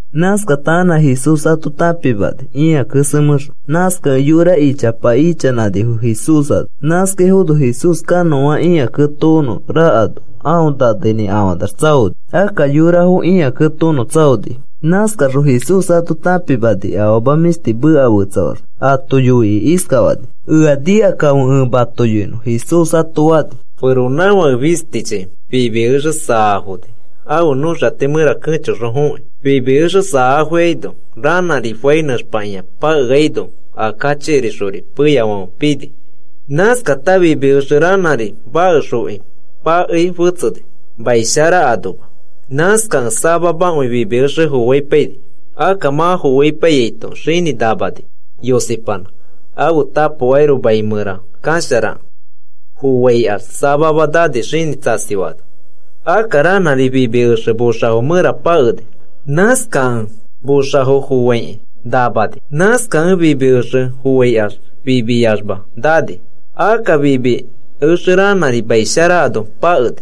Nãskata anã Jesús ato tãpimani ĩa kesemẽxõ. Nãskakẽ yora ichapa ichanãnifo Jesús ano. Nãskaifono Jesús kanõa ĩa ketokonõ rakano aõ naneinĩkafanax tsaoni. Akka yorafo ĩa ketokonõ tsaonifo. Nãskaxõ Jesús ato tãpimani afama mĩshti meka fetsafaxõ. Ato yoikĩ iskafani: “Ea nikakãfe ẽ mato yoinõ,” Jesús ato fani. “Feronãfake fistichi fimi exe saafoni ãfe nõxati mẽra kẽchoxõ fokĩ. Fimi exe saafoikaino ranãri fai nẽxpakĩa pakeaino a kachikirixori peyafãfe pini. Nãskata fimi exe ranãri makexfoki pakei fetseni mai shara anoma. Nãskakẽ samamakõi fimi exe foaipaini. Akka mã foaipaiyaito xinĩ namani, yosipanã, ãfe tapokairoko mai mẽra kasharakẽ. Foaikax, samama nani xinĩ tsasifaano. Akka ranãri fimi exe moxafo mẽra pakeni. Nãskakẽ moxafo foaikĩ namani. Nãskakẽ fimi exe foaikax fimiyamax nani. Akka fimi exe ranãri mai shara ano pakeni.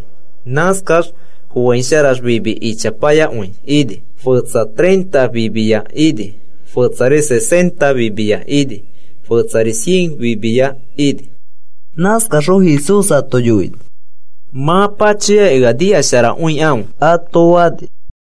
Nãskax foaisharax fimi ichapayakõi ini. Fetsa treinta fimiya ini. Fetsa sesenta fimiya ini. Fetsari cien fimiya ini.” Nãskaxõ Jesús ato yoini: “Mã pachoyakĩ ea nikasharakõikãfe,” ato fani.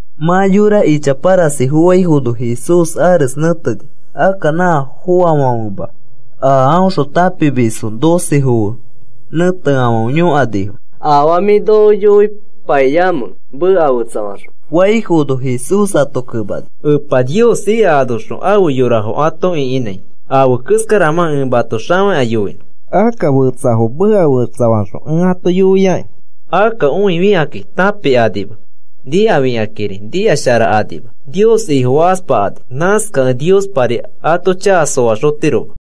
Mã yora ichapa rasi foaifono Jesús ares nẽteni, akka nã foafãfema a aõxõ tãpimisfo docefo fe nẽteafãfe yõkanifo. “¿Afaa mĩ noko yoipaiamẽ meka fetsafaxõ?” faifono, Jesús ato kemani, “Epa Niospa a ika anoxõ afe yorafo ato ĩkinãi afe keskaramãkĩ ẽ mato xafakĩa yoinõ. Akka fetsafo meka fetsafaxõ ẽ ato yoiaki. Akka õifikakĩ tãpikanima nikafikakĩri nikasharakanima. Nios Ifofakaspakani. Nãskakẽ Niospari ato chaka soaxotiroma.”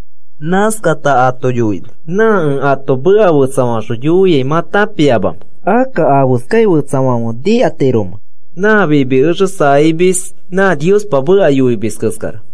Nãskata ato yoini: “¿Nã ẽ ato meka fetsafaxõ yoiai mã tãpiamamẽ? Akka, ¿afeskakĩ fẽtsa nikatiromẽ? Nã fimi exe fanamis, nã Niospa meka yoimis keskara.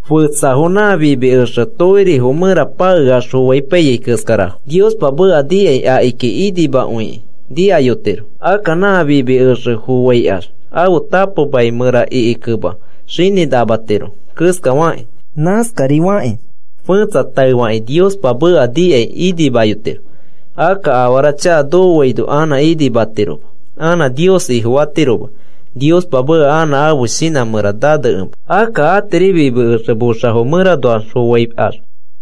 Fetsafo nã fimi exe tokirifo mẽra pakeax foaipaiyai keskarafo. Niospa meka nikai akiki inimakõikĩ nikayotiro. Akka nã fimi exe foaikax ãfe tapo mai mẽra ikikẽma xinĩ namatiro keskafakĩ. Nãskarifakĩ fẽtsa taefakĩ Niospa meka nikai inimayotiro. Akka afara chaka nokoaino anã inimatiroma anã Nios Ifofatiroma, Niospa meka anã ãfe shinã mẽra nanekema. Akka atiri fimi exe moxafo mẽranoax foaikax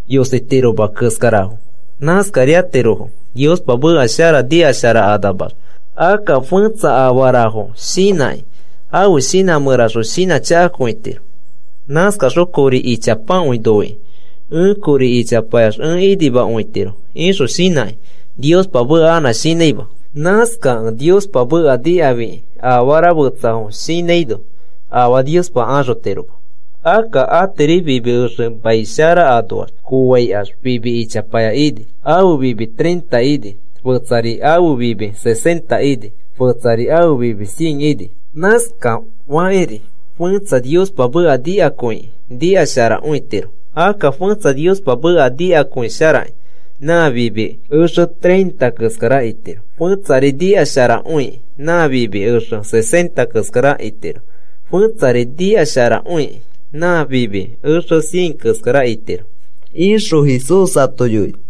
yositiroma keskarafo. Nãskariatirofo Niospa meka shara nikasharakanaxma. Akka fẽtsa afarafo shinãkĩ ãfe shinã mẽraxõ shinãchakakõitiro. Nãskaxõ kori ichapakõi noikĩ, ‘Ẽ kori ichapayax ẽ inimakõitiro,’ ixõ shinãkĩ Niospa meka anã shinãima. Nãskakẽ Niospa meka nikafikĩ afara fetsafo shinãino afaa Niospa axotiroma. Akka atiri fimi exe mai shara anoax foaikax fimi ichaya ini. Ãfe fimi treinta ini, fetsari afe fimi sesenta ini, fetsari ãfe fimi cien ini. Nãskafakĩri fẽtsa Niospa meka nikakõikĩ nikasharakõitiro. Akka fẽtsa Niospa meka nikakõisharakĩ nã fimi exe treinta keskara itiro, fetsari nikasharakõikĩ nã fimi exe sesenta keskara itiro, fẽtsari nikasharakõikĩ nã fimi exe cien keskara itiro,” ixõ Jesús ato yoini.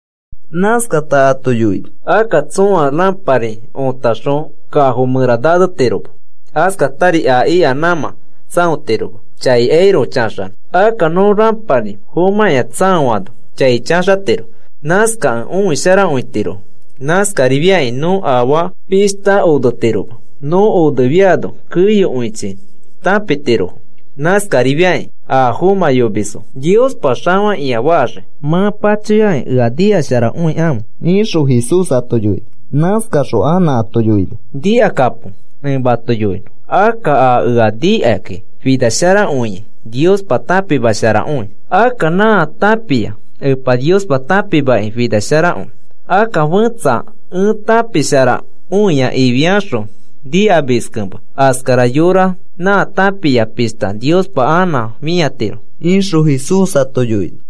Nãskatari ato yoini. “Akka tsõa rãpari otaxõ kafo mẽra nanetiroma, askatari a ika nãmã tsãotiroma chaikairoko chaxanõ. Akka nõ rãpari fomãkĩa tsãofaano chai chaxatiro. Nãskakẽ õisharakõitirofo. Nãskarifiakĩ nõ afaa pishta onetiroma, nõ onefiano keyokõichi tãpitirofo. Nãskarifiakĩ a fomãyomisfo Niospa xafakĩa faxii. Mã pachoyakĩ ea nikasharakõikãfe,” ixõ Jesús ato yoini. Nãskaxõ anã ato yoini. “Nikakapo, ẽ mato yoinõ. Akka a ea nikakĩ finasharakõiai, Niospa tãpimasharakõi. Akka nã tãpia nã Epa Niospa tãpimakĩ finasharakõi. Akka fetsa ẽ tãpisharakõia ifiaxõ nikamiskẽma, askara yora nã tãpia pishta Niospa anã fĩatiro,” ixõ Jesús ato yoini.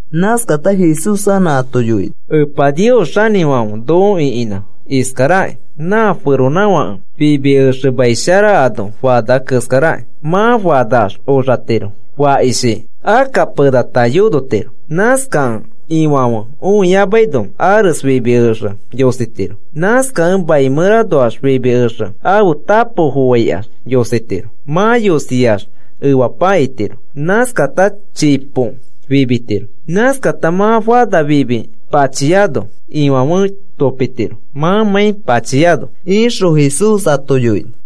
Nãskata Jesús anã ato yoini. “Epa Nios xanĩfãfe noko ĩkinã iskaraki. Nã feronãfãke fimi exe mai shara ano fana keskaraki. Mã fanax oxatiro fakishi, akka penata yonotiro. Nãskakẽ ifãfe õiyamaino ares fimi exe yositiro. Nãskakẽ mai mẽranoax fimi exe ãfe tapo foaikax yositiro. Mã yosiax efapa itiro, nãskata chipo fimitiro. Nãskata mã fana fimi pachiano, ifãfe topitiro mãmãi pachiano,” ixõ Jesús ato yoini.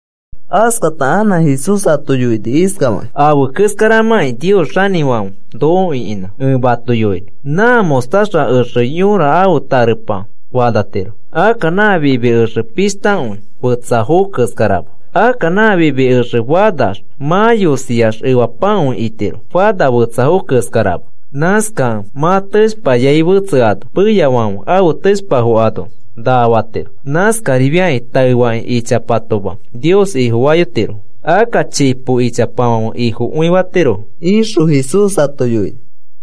Askata anã Jesús ato yoini iskafakĩ: “Afe keskaramãkĩ Nios xanĩfãfe noko ĩkinã ẽ mato yoinõ. Nã mostaza exe yõra ãfe tarepa fanatiro. Akka nã fimi exe pishtakõi fetsafo keskerama. Akka nã fimi exe fanax, mã yosiax efapakõi itiro fana fetsafo keskarama. Nãskakẽ mã teshpapafai fetseano peyafãfe ãfe teshpafo ano naa fatiro. Nãskarifiakĩ taefakĩ ichapatoma Nios Ifofayotirofo. Akka chipo ichapafãfe Ifofakõitirofo,” ixõ Jesús ato yoini.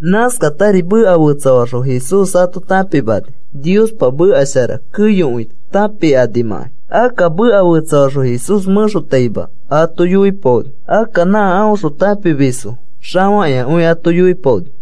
Nãskatari meka fetsafaxõ Jesús ato tãpimani Niospa meka shara keyokõi tãpikanimãkai. Akka meka fetsafaxõ Jesús mẽxotaima ato yoipaoni. Akka nã aõxõ tãpimisfo xafakĩakõi ato yoipaoni.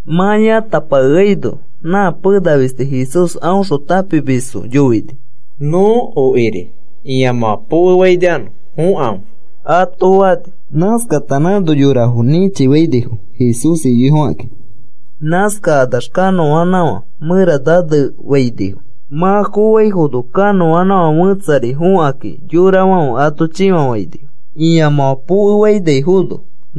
Mã yãtapakeaino nã pena fisti Jesús aõxõ tãpimisfo yoini: “Nõ okiri ĩamãfã pokefainikanõ, fokãfe,” ato fani. Nãskata nãno yorafo nĩchifainifo, Jesús iyoifokakĩ. Nãskakanax kanoãnãfã mẽra nanefainifo. Mã foaifono kanõanãfã fẽtsari fokãkĩ yorafãfe ato chĩfafainifo. Ĩamãfã pokefainaifono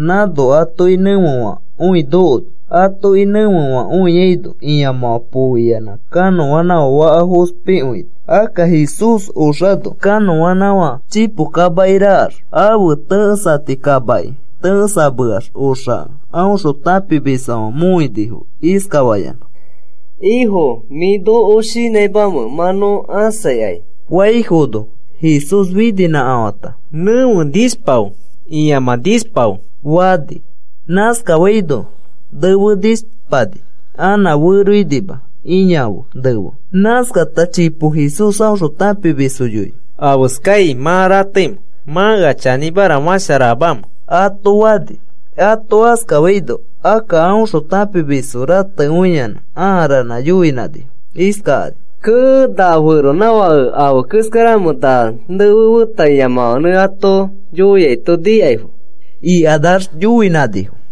nãno atoki nẽfefãkõi nokoni. Atoki nẽfefãkõiaino ĩamãfã pooiyanã kanõanãfã faka fospikõini. Akka Jesús oxano kanõanãfã chipo kamaki rakax, ãfe tẽkesati kamaki tẽkesameax. Oxakẽ aõxõ tãpimisfãfe mõinifo iskafayanã: “¿Ifo, mĩ noko shinãimamẽ mã nõ ãsaikai?” faifono, Jesús fininĩkafãta, “Nẽfe, nishpafe,” fata, “Ĩamã nishpafe,” fani. Nãskafaino nefe nishpani anã feroinima ĩa fe nefe. Nãskata chipo Jesús aõxõ tãpimisfo yoini. “¿Afeskai mã rateimẽ? ¿Mã ea chanĩmara fasharamamẽ?” ato fani. Ato askafaino, akka aõxõ tãpimisfo ratekõiyanã ãa ranã yoinãnifo iskakani: “¡Kee! ¿Na feronãfake afe keskaramẽ na nefe feta ĩamãfãnẽ ato yoiaito nikaifo?” ikanax yoinãnifo.